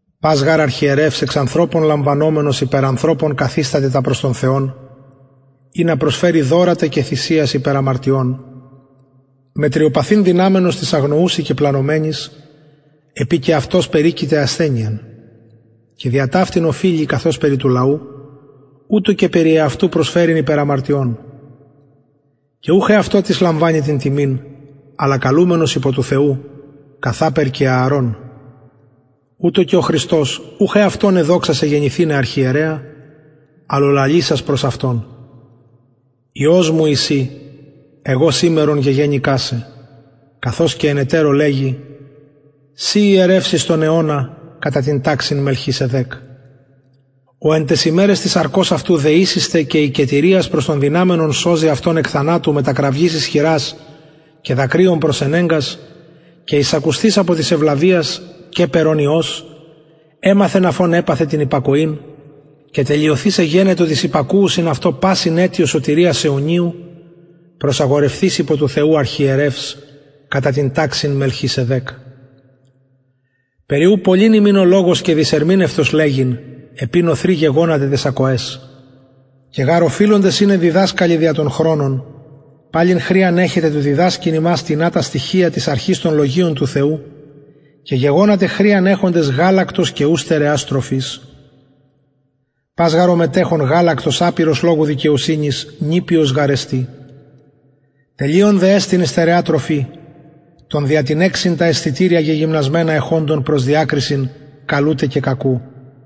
πας γαρ αρχιερευς εξ ανθρωπων λαμβανομενος υπερ ανθρωπων καθισταται τα προς τον θεον ινα προσφερη δωρα τε και θυσιας υπερ αμαρτιων μετριοπαθειν δυναμενος τοις αγνοουσιν και πλανωμενοις επει και αυτος περικειται ασθενειαν και δια ταυτην οφειλει καθως περι του λαου ουτως και περι εαυτου προσφερειν υπερ αμαρτιων και ουχ εαυτω τις λαμβανει την τιμην αλλα καλουμενος υπο του θεου καθαπερ και ααρων ουτως και ο χριστος ουχ εαυτον εδοξασεν γενηθηναι αρχιερεα αλλ ο λαλησας προς αυτον υιος μου ει συ εγω σημερον γεγεννηκα σε καθως και εν ετερω λεγει συ ιερευς εις τον αιωνα κατα την ταξιν μελχισεδεκ ος εν ταις ημεραις της σαρκος αυτου δεησεις τε και ικετηριας προς τον δυναμενον σωζειν αυτον εκ θανατου μετα κραυγης ισχυρας και δακρυων προσενεγκας και εισακουσθεις απο της ευλαβειας καιπερ ων υιος εμαθεν αφ ων επαθεν την υπακοην και τελειωθεις εγενετο τοις υπακουουσιν αυτω πασιν αιτιος σωτηριας αιωνιου προσαγορευθεις υπο του θεου αρχιερευς κατα την ταξιν μελχισεδεκ περι ου πολυς ημιν ο λογος και δυσερμηνευτος λεγειν επει νωθροι γεγονατε ταις ακοαις και γαρ οφειλοντες ειναι διδασκαλοι δια τον χρονον παλιν χρειαν εχετε του διδασκειν υμας τινα τα στοιχεια της αρχης των λογιων του θεου και γεγονατε χρειαν εχοντες γαλακτος και ου στερεας τροφης πας γαρ ο μετεχων γαλακτος απειρος λογου δικαιοσυνης νηπιος γαρ εστιν τελειων δε εστιν η στερεα τροφη των δια την εξιν τα αισθητηρια γεγυμνασμενα εχοντων προς διακρισιν καλου τε και κακου